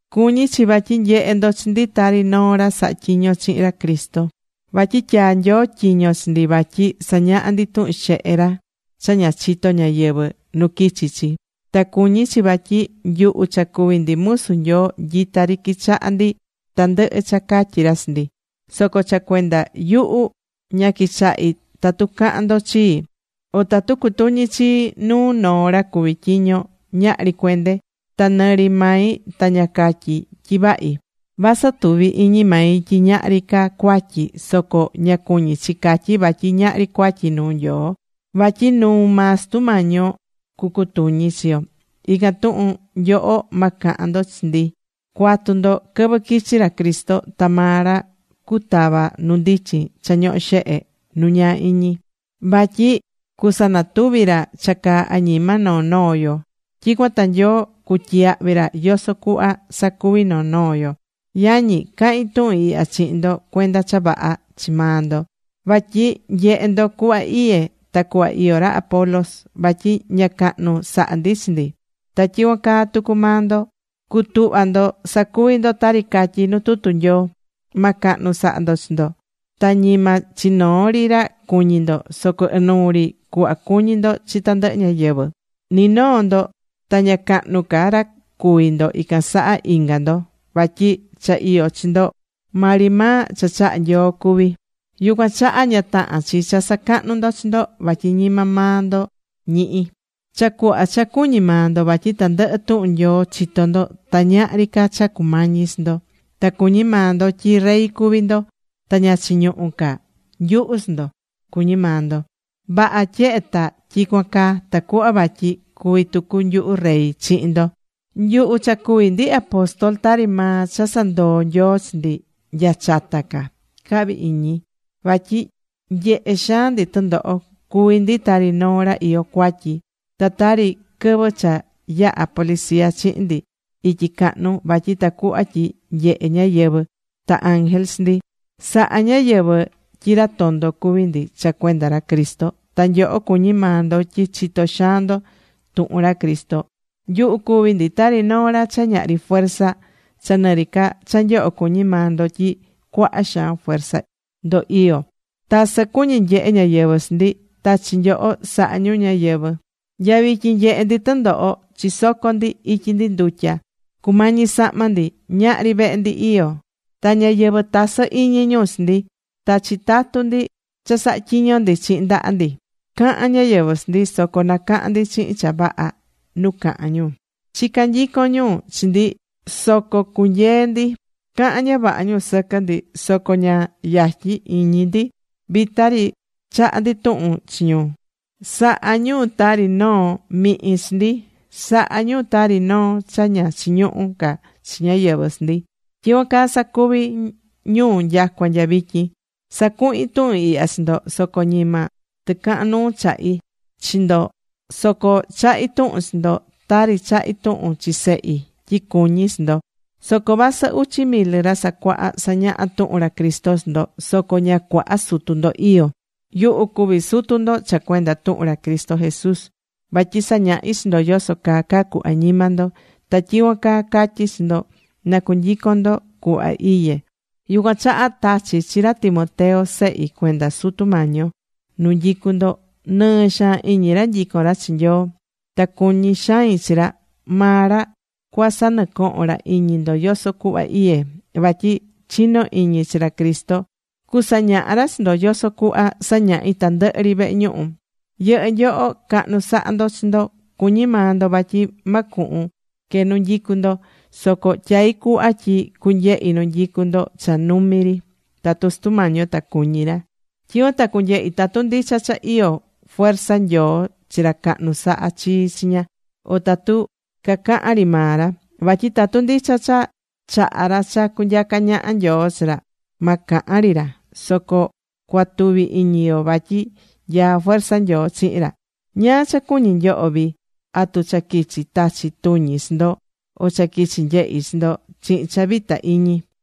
Cuñí chi vatyi nyehé ndo chi ndi tari noo ra sahá tyiño chihin ra Cristo. Vatyi tyaa̱ Nyoo tyiño chi ndi vatyi sañaha ndi tuhun xehe ra cha ña chitó ñáyɨvɨ nu quichi̱ chi. Ta cuñí chi vatyi nyuhu cha cuví ndi musu Nyoo nyita ri quichahá ndi tandɨhɨ cha catyí ra chi ndi. Soco cha cuenda yuhu, ña quichahí tatu cahán ndo chii. O tatu cutuñí chii nuu noo ra cuví tyiño, ñahri cuende. Ta nɨ ri mai ta ña catyí tyi vahi. Vasɨ tuví iñi mai tyi ñahri ca cuatyi, soco ña cuñí chi catyí vatyi ñahri cuatyi nuu Nyoo. Vatyi nuu maa Sutu Mañi yo cucutuñí chi yo. Ican tuhun, nyoho ma cahan ndo chi ndi. Cua̱tu ndo quɨvɨ quichi ra Cristo. Ta maa ra cutava nu ndichin cha ñohó xehe nu ñaa iñi. Vatyi cusanatuvi ra cha caá añima noo noo yo. Tyicuan ta Nyoo cutyiyahvi ra yoso cuhva sacuvi̱ noo noo yo. Yañi, cahín tuhun ihya chihin ndo cuenda cha vaha chi maa ndo. Vatyi nyehé ndo cuhva iyé, ta cuhva iyó ra Apolos. Vatyi ña cahnu sahá ndi chi ndi. Ta tyicuan caa tucu maa ndo, cu̱tuhva ndo sacuvi ndo tari catyí nu tutu Nyoo: Ma cahnu sa̱ha ndo chi ndo. Ta ñima chi noo ri ra cuñi ndo. Soco ɨnuu ri cuhva cu̱ñi ndo chi tandɨhɨ ñáyɨvɨ. Ni noo ndo ta ña cahnu ca ra cuví ndo ican saha inga ndo. Vatyi cha iyó chi ndo maa ri maa cha chahá Nyoo cuví. Yucuan chaha ña tahán chi cha sacahnú ndo chi ndo, vatyi ñima maa ndo ñihi̱. Cha cuhva cha cuñí maa ndo vatyi tandɨhɨ tuhun Nyoo chitó ndo, ta ñahri ca cha cumañí chi ndo. Ta cuñí maa ndo tyi Rey cuví ndo. Ta ña chiñuhú ca nyuhu chi ndo, cuñí maa ndo. Vaha tyehe ta tyicuan caa, tacuhva vatyi cuvi tucu nyuhu rey chihin ndo. Nyuhu cha cuví ndi apóstol, tari maa cha sandoo̱ Nyoo chi ndi nya chata ca, cahvi iñi. Vatyi nyehé xaan ndi tɨndoho. Cuví ndi tari noo ra iyó cuatyi, ta tari quɨvɨ cha yahá policía chihin ndi ityi cahnu vatyi tacuhva tyi nyehe ñáyɨvɨ ta ángel chi ndi. Sahá ñáyɨvɨ tyi ra tondo cuví ndi cha cuenda ra Cristo. Ta nyoho cuñí maa ndo tyi chitó xaan ndo tuhun ra Cristo. Nyuhu cuví ndi tari noo ra cha ñahri fuerza, cha nɨ ri ca cha nyoho cuñí maa ndo tyi cuaha xaan fuerza ndo iyó. Tasɨ cuñí nyehe ñáyɨvɨ chi ndi, ta chi nyoho sahá ñu ñáyɨvɨ. Nya vityin, nyehé ndi tɨndoho. Chisocó ndi. Ityi ndi ndutya. Cumañí sahma ndi. Ñahrí vehe ndi iyó. Ta ñáyɨvɨ, tasɨ́ iñi ñu chi ndi. Ta chitatú ndi cha sahá tyiño ndi chihin ndaha ndi. Cahán ñáyɨvɨ chi ndi. Soco nacahán ndi chihin cha vaha nu cahan ñu. Chicá nyicon ñu chi ndi soco cunyeé ndi. Cahán ña vaha ñu sɨquɨ ndi. Soco ña yatyín iñi ndi, vita ri chaha ndi tuhun chi ñu. Sahá ñu tari noo mihin chi ndi. Sahá ñu tari noo cha ña chiñuhú ca chi ñáyɨvɨ chi ndi. Tyicuan caa sacuví ñu nyacua nya vityin. Sacuhín tuhun ihya chi ndo, soco ñima tɨcahan nuu chahí chi ndo. Soco chahí tuhun chi ndo tari chahí tuhun chi sehi tyi cuñí chi ndo. Soco vasɨ uchi mil ra sacuahá sañahá tuhun ra Cristo chi ndo, soco ña cuaha sutu ndo iyó. Yuhu cuví sutu ndo cha cuenda tuhun ra Cristo Jesús. Vatyi sañahí chi ndo yoso caa cacú añima ndo. Ta tyicuan caa catyí chi ndo na cu̱nyicon ndo cuhva iyé. Yucuan chaha tachí chi ra Timoteo, sehi cuenda Sutu Mañi yo, nu nyicu ndo. Nɨɨ xaan iñi ra nyicón ra chi Nyoo. Ta cuñí xain chi ra. Maa ra cuasanɨcohon ra iñi ndo yoso cuhva iyé, vatyi chinó iñi chi ra Cristo. Cusañaha ra chi ndo yoso cuhva sañahí tandɨhɨ ri vehe ñuhu. Yɨhɨ́ nyoho cahnu sahá ndo chi ndo. Cuñí maa ndo vatyi ma cuhun que nu nyicú ndo. Soco tyaí cuhva tyi cunyehi nu nyicu ndo cha numi ri, tatu Sutu Mañi yo ta cuñí ra. Tyicuan ta cunyehi tatu ndicha cha iyó fuerza Nyoo chi ra cahnu sahá chii chiña, o tatu cacahán ri maa ra. Vatyi tatu ndicha cha chahá ra cha cunyacá ñaha Nyoo chi ra, ma cahan ri ra. Soco cuatuvi iñi yo vatyi nyaá fuerza Nyoo chihin ra. ¿Ñáá cha cuñí nyoho vii? ¿Atu cha quichi tachi tuñi chi ndo, o cha quichi nyehi chi ndo chihin cha vita iñi?